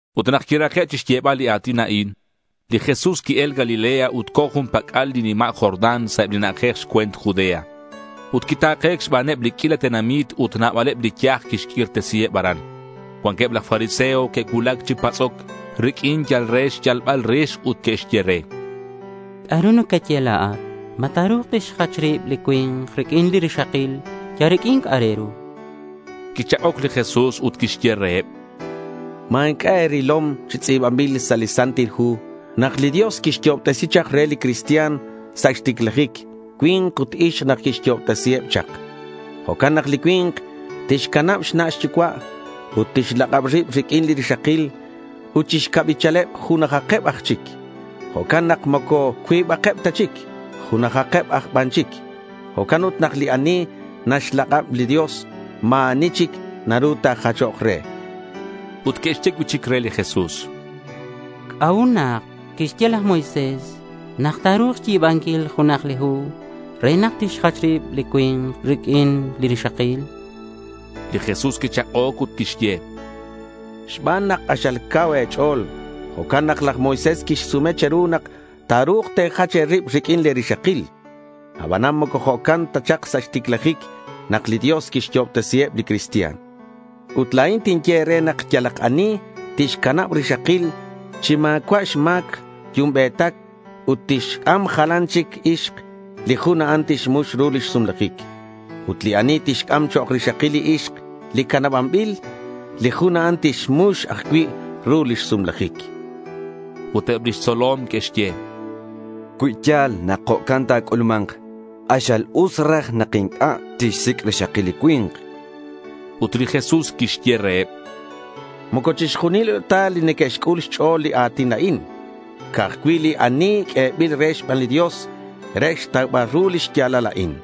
Ut nak quirake' chixyebal li a̱tin a'in, li Jesús qui-el Galilea ut co̱ jun pac'al li nima' Jordán sa' eb li na'ajej xcue̱nt Judea. Ut quita̱ke̱c xbaneb li q'uila tenamit ut nabaleb li yaj quixq'uirtesiheb aran. Cuanqueb laj fariseo que'cuulac chi patz'oc riq'uin yal re xyalbal rix ut que'xye re: —¿C'a'ru nacaye la̱at? ¿Ma ta̱ru̱k tixjach rib li cui̱nk riq'uin li rixakil yal riq'uin c'a'ak re ru?— Quichak'oc li Jesús ut quixye reheb: —¿Ma inc'a' e̱rilom li tz'i̱banbil sa' li Santil Hu nak li Dios quiyo'obtesin chak re li cristian sa' xticlajic, cui̱nk ut ixk nak quixyo'obtesiheb chak? Jo'can nak li cui̱nk tixcanab xna' xyucua' ut tixlak'ab rib riq'uin li rixakil. Ut chi xcabichaleb junajakeb aj chic. Jo'can nak moco cuibakeb ta chic. Junajakeb aj ban chic. Jo'can ut nak li ani naxlak'ab li Dios, ma̱ ani chic naru najachoc re, chan. Ut que'xye cui'chic re li Jesús: —¿C'a'ut nak quixye laj Moisés nak ta̱ru̱k xyi̱banquil junak li hu re nak tixjach rib li cui̱nk riq'uin li rixakil?— Li Jesús quichak'oc ut quixye: —Xban nak k'axal cau e̱ch'o̱l, jo'can nak laj Moisés quixsume che̱ru nak ta̱ru̱k te̱jach e̱rib riq'uin le̱ rixakil. Aban moco jo'can ta chak sa' xticlajic nak li Dios quixyo'obtesiheb li cristian. Ut la̱in tinye e̱re nak yalak ani tixcanab rixakil chi ma̱cua' xma̱c yumbe̱tac, ut tixc'am jalan chic ixk, li jun a'an tixmux ru lix sumlajic. Ut li ani tixc'am chok' rixakil li ixk li canabanbil, li jun a'an tixmux ajcui' ru lix sumlajic, chan li Jesús. Ut eb lix tzolom que'xye: —Cui ya̱l nak jo'can ta̱c'ulma̱nk, k'axal us raj nak inc'a' tixsic' rixakil li cui̱nk, chanqueb. Ut li Jesús quixye reheb: —Moco chixjunileb ta neque'xc'ul xch'o̱l li a̱tin a'in, ca'aj cui' li ani q'uebil re xban li Dios re xtaubal ru li xya̱lal a'in.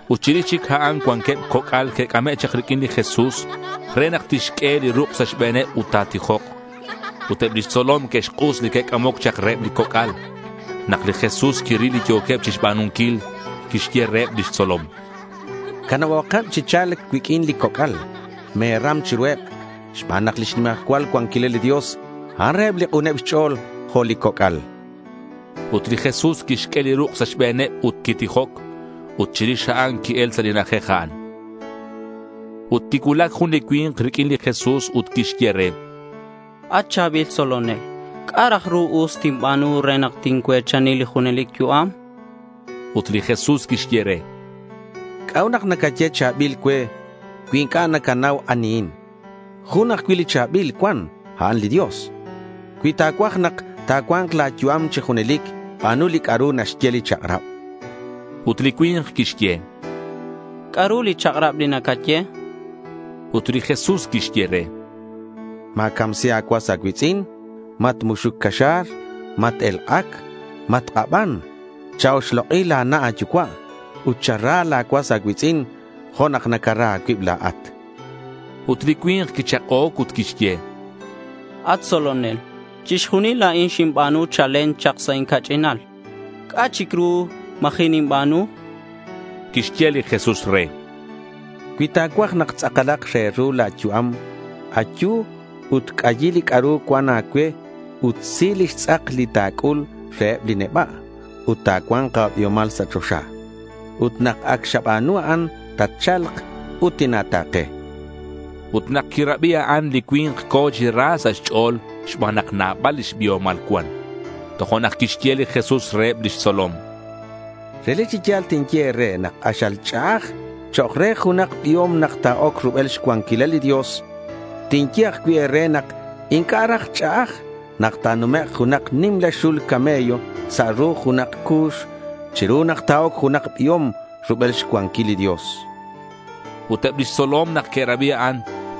Ut chirix chic a'an cuanqueb coc'al que'c'ame' chak riq'uin li Jesús re nak tixq'ue li ruk' sa' xbe̱neb ut ta̱tijok. Ut eb lix tzolom que'xk'us li que'c'amoc chak reheb li coc'al. Nak li Jesús quiril li yo̱queb chixba̱nunquil, quixye reheb lix tzolom: —Canabomakeb chi cha̱lc cuiq'uin li coc'al. Me̱ram chiruheb xban nak lix nimajcual cuanquilal li Dios, a'an reheb li k'uneb xch'o̱l jo' li coc'al, chan. Ut li Jesús quixq'ue li ruk' sa' xbe̱neb ut quitijoc. Ut chirix a'an qui-el sa' li na'ajej a'an. Ut quicuulac jun li cui̱nk riq'uin li Jesús ut quixye re: —At cha̱bil tzolonel, ¿C'a' raj ru us tinba̱nu re nak tincue̱chani li junelic yu'am? chan. Ut li Jesús quixye re: —¿C'a'ut nak nacaye cha̱bil cue cui inc'a' nacanau anihin? Jun ajcui' li cha̱bil cuan ut a'an li Dios. Cui ta̱cuaj nak ta̱cua̱nk la̱ yu'am chi junelic ba̱nu li c'a'ru naxye li chak'rab.— Ut li cui̱nk quixye: —¿C'a'ru li chak'rab li nacaye?— Ut li Jesús quixye re: —Ma̱camsi a̱cuas a̱cui̱tz'in. Matmuxuc caxa̱r. Mat-elk'ac. Matk'aban. Cha-oxlok'i la̱ na' a̱yucua' ut chara la̱ cuas a̱cui̱tz'in jo' nak nacara a̱cuib la̱at, chan. Ut li cui̱nk quichak'oc ut quixye: —At tzolonel, chixjunil a'in xinba̱nu chalen chak sa' inca'ch'inal. ¿C'a' chic ru ma̱ji' ninba̱nu?— Quixye li Jesús re: —Cui ta̱cuaj nak tz'akalak re ru la̱ yu'am, ayu ut c'ayi li c'a'ru cuan a̱cue ut si lix tz'ak li ta̱c'ul reheb li neba'. Ut ta̱cua̱nk a̱biomal sa' choxa. Ut nak ac xaba̱nu a'an tatcha̱lk ut tina̱ta̱ke, chan li Jesús re. Ut nak quirabi a'an, li cui̱nk co̱ chi ra sa' xch'o̱l xban nak nabal lix biomal cuan. Tojo'nak quixye li Jesús reheb lix tzolom: —Relic chi ya̱l tinye e̱re, k'axal ch'a'aj chok' re junak biom nak ta̱oc rubel xcuanquil li Dios. Tinye ajcui' e̱re nak inc'a' raj ch'a'aj nak ta̱numek' junak nimla xul camello sa' ru junak cu̱x chiru nak ta̱oc junak biom rubel xcuanquil li Dios. Ut eb lix tzolom nak que'rabi a'an,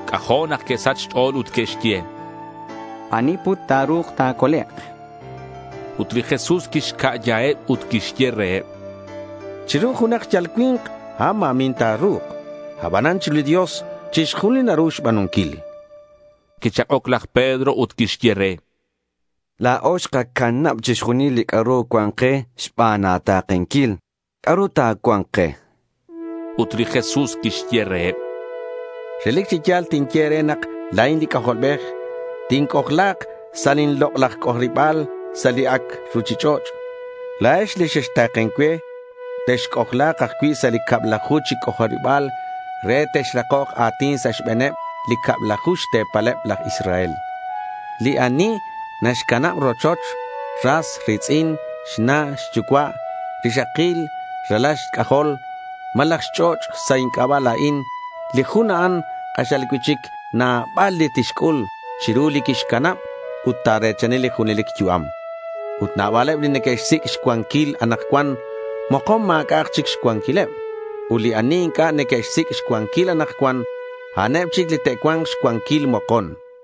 c'ajo' nak que'sach xch'o̱l ut que'xye: —¿Ani put ta̱ru̱k ta̱colek'? chanqueb. Ut li Jesús quixca'yaheb ut quixye reheb: —Chiru junak yal cui̱nk a'an ma̱min ta̱ru̱k, abanan chiru li Dios chixjunil naru xba̱nunquil. Quichak'oc laj Pedro ut quixye re: —La̱o xkacanab chixjunil li c'a'ru cuan ke xban a̱ta̱kenquil. ¿C'a'ru ta̱cua̱nk ke?— Ut li Jesús quixye reheb: —Relic chi ya̱l tinye e̱re nak la̱in li C'ajolbej tinc'ojla̱k sa' lin lok'laj c'ojariba̱l sa' li ac' ruchich'och', la̱ex li xexta̱ken cue, texc'ojla̱k ajcui' sa' li cablaju chi c'ojariba̱l re texrakok a̱tin sa' xbe̱neb li cablaju xte̱paleb laj Israel. Li ani naxcanab rochoch, ras ri̱tz'in, xna' xyucua', rixakil, ralal xc'ajol, malaj xch'och' sa' inc'aba' la̱in, li jun a'an k'axal cui'chic nabal li tixc'ul chiru li quixcanab ut ta̱re̱chani li junelic yu'am. Ut nabaleb li neque'xsic' xcuanquil anakcuan, mokon ma̱c'a'ak chic xcuanquileb. Ut li ani inc'a' neque'xsic' xcuanquil anakcuan, a'aneb chic li te'cua̱nk xcuanquil mokon, chan li Jesús.